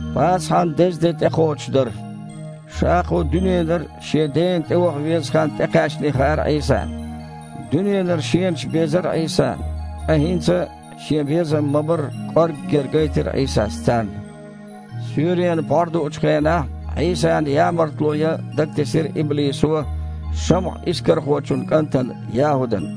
Пасахьан деза де тІекхочуш дара. Ша кху дуьненара Шен Дена тІеваха веза хан тІекхаьчний хаьара Іийсана. Дуьненара Шенаш безара Іийсана, ткъа хІинца Шен безам ма-барра кІорггера гайтира Іийсас царна. Суьйренан пхьор дуучу хенахь Іийсана ямартло ян дагатесира иблисо ШамІа-Искархочун кІантана ЯхІудана.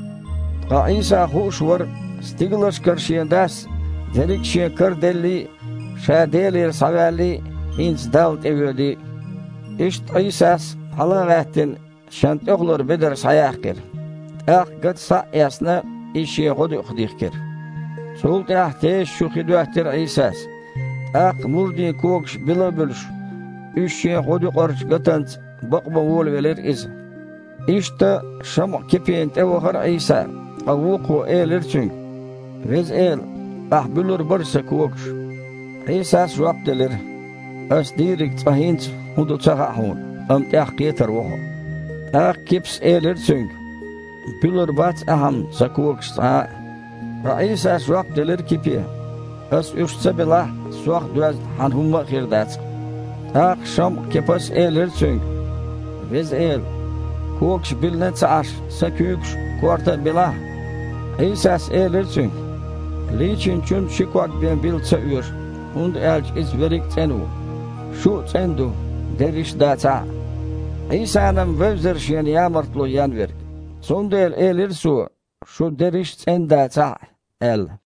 Ткъа Іийса хууш вара стигалшкара Шен Дас дерриг а Шен кара деллий а, Ша Делера схьаваьллий а, хІинца Далла тІевоьдий а. Иштта Іийсас, хьала а гІаьттина, Шен тІехулара бедар схьаяьккхира. ТІаккха гата схьа а эцна, иза Шен гІодаюкъах дихкира. Цул тІаьхьа теса чу хи доьттира Іийсас. ТІаккха мурдийн когаш била а буьлуш, уьш Шен гІодаюкъарчу гатанца бакъабан волавелира Иза. Иштта ШамІа-Кипина тІе а вахара Іийса, ткъа вукхо элира Цуьнга: «Веза Эла, Ахь буьлур бара сан когаш?» Іийсас жоп делира: «Ас дийриг цкъа хІинца хІун ду ца хаьа хьуна, амма тІаьхьа кхетар ву хьо». ТІаккха Кипас элира Цуьнга: «Буьлур бац Ахьа-м сан когаш цкъа а». Ткъа Іийсас жоп делира Кипе: «Ас уьш ца билахь, Сох доьзна хьан хІумма а хир дац-кх». ТІаккха ШамІа-Кипас элира Цуьнга: «Веза Эла, когаш билина а ца Іаш, сан куьйгаш а, корта а билахь!» Іийсас элира цуьнга: «Лийчиначун ши ког бен била ца оьшу, хІунда аьлча иза верриг а цІена ву. Шу а цІена ду, дерриш дацахь а». Іийсана-м вевзара Шена ямартло ен верг. Цундела элира Цо: «Шу дерриш цІена дацахь а», – аьлла.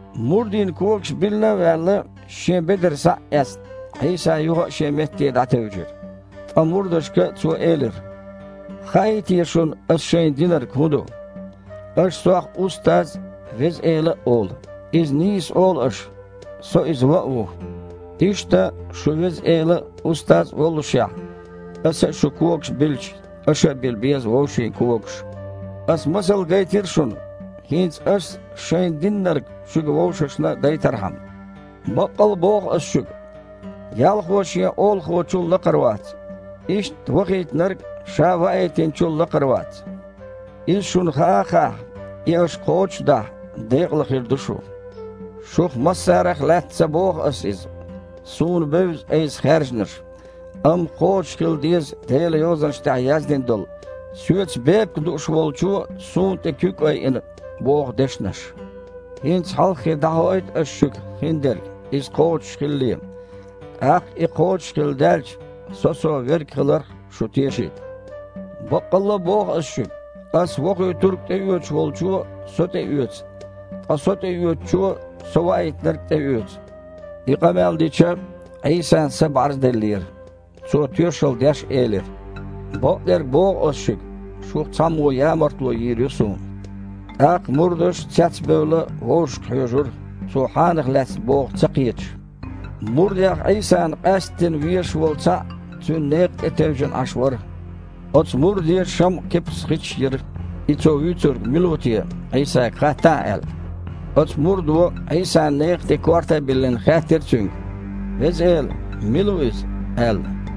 Мурдийн когаш билина а ваьлла, Шен бедар схьа а эцна, Іийса юха а Шен метте дІатевжира. Ткъа мурдашка Цо элира: «Хаьий те шуна Ас шайна динарг хІун ду? Аша Сох „Устаз“ а, „Веза Эла“ а олу, иза нийса олу аша, Со Иза ван а ву. Иштта, шун Веза Эла а, Устаз а воллушехь, Аса а шун когаш билча, аша а била беза вовшийн когаш. Аса масал гайтира шуна. ХІинца Ас шайна диннарг шуьга вовшашна а дайтархьама. Баккъалла а боху Ас шуьга: „Ялхо шен олахочул лакхара вац. Иштта вахийтинарг а ша ваийтинчул лакхара вац“. Иза шуна хаа а хаахь, и аша кхочуш а дахь, декъала хир ду шу. Шух массарах лаьцна ца боху Ас иза. Суна бевза Айса хаьржинарш. Амма кхочушхила деза Делан Йозанаш тІехь яздина долу: „Соьца бепиг дууш волчо Суна тІе куьг айина“, – боху дешнаш. ХІинца хьалххе дІахоуьйту Ас шуьга хиндерг, иза кхочушхилале, тІаккха и кхочушхилла даьлча, Со Со Верг хиларх шу тешийта. Баккъалла боху Ас шуьга: Ас Вохуьйтург тІеоьцуш волчо Со тІеоьцу, ткъа Со тІеоьцучо Со Ваийтинарг а тІеоьцу». И къамел дича, Іийсан са бІарзделлера. Цо, тоьшалла деш, элира: «Бакъдерг боху Ас шуьга, шух цхьаммо ямартло йийр ю Суна». ТІаккха мурдаш, цецбевлла, вовшашка хьоьжура, Цо хьанах лаьцна боху ца кхеташ. Мурдех Іийсана къаьсттина везаш волу цхьаъ Цуьнан некха тІе тевжина Іаш вара. Оцу мурде ШамІа-Кипас хичаш йира, и Цо вуьйцург мила ву те, Іийсага хаттахь аьлла. Оцу мурдо, Іийсан некха тІе корта а биллина, хаьттира Цуьнга: «Веза Эла! Мила ву иза?» – аьлла.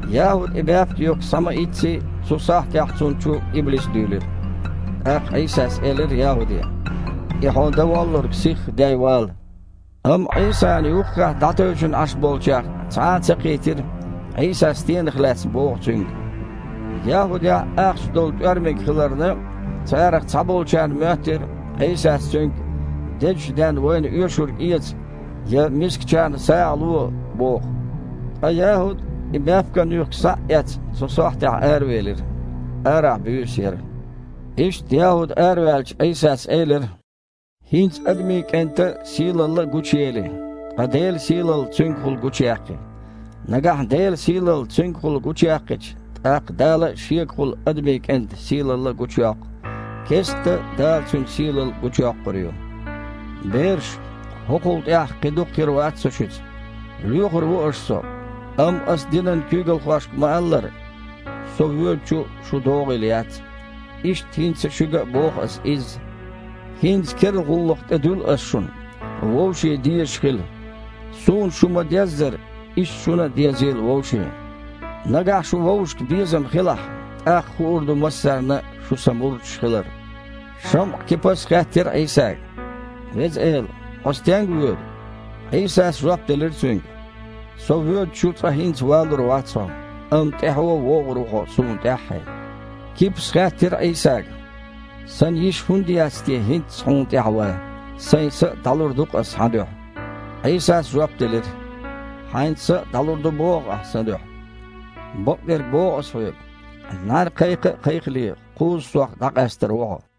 ЯхІуда и баьпкан юьхк схьа-ма-ийцци, цу сахьттехь, цунна чу иблис дуьйлира. ТІаккха Іийсас элира ЯхІуде: «И хьо дан воллург сихха дей вала». Амма Іийсана юххехь дІатевжина Іаш болчех цхьа а ца кхийтира, Іийсас стенах лаьцна боху цуьнга. ЯхІудехь ахча долу тІоьрмаг хиларна, царах цхьаболчарна моьттира, Іийсас цуьнга: «Дезачу денна вайна оьшург эца», – я: «Мискачарна сагІа ло», – боху. Ткъа ЯхІуд, и баьпкан юьхк схьа а эцна, цу сахьтехь аравелира. Арахь буьйса яра. Иштта, ЯхІуд араваьлча, Іийсас элира: «ХІинца Адамийн КІентан сийлалла а гучуели, ткъа Делан сийлалла Цуьнгахула гучуяьккхи. Нагахь Делан сийлалла Цуьнгахула гучуяьккхича, тІаккха Дала а Шегахула Адамийн КІентан сийлалла гучуйоккху. Кестта Дала Цуьнан сийлалла гучуйоккхур ю. Бераш! ХІокхул тІаьхьа кхин дукха хир вац Со шуьца. Лоьхур ву аша Со. Амма Ас динан куьйгалхошка ма-аллара: „Со воьдучу шун догІийла яц“, иштта хІинца шуьга а боху Ас изза. ХІинца керла гІуллакх тІедуьллу Ас шуна: вовшийн дезаш хила. Суна шу ма-деззара, иштта шуна а дезийла вовшийн. Нагахь шун вовшашка безам хилахь, тІаккха хуур ду массарна а шу Сан мурдаш хилар». ШамІа-Кипас хаьттира Іийсага: «Веза Эла! Хьо стенга воьду?» Іийсас жоп делира цуьнга: «Со воьдучу цкъа хІинца валур вац хьо, амма тІаьхьо вогІур ву хьо Суна тІаьххье». Кипас хаьттира Іийсага: «Сан йиш хІунда яц те хІинцца Хьуна тІаьхьа ван? Сайн са а дІалур ду-кх ас Хьан дуьхьа». Іийсас жоп делира: «Хьайн са а дІалур ду боху ахь Сан дуьхьа? Бакъдерг боху Ас хьоьга: „НІаьна кхайкха а кхайкхале, кхузза Сох дІакъаьстар ву хьо“».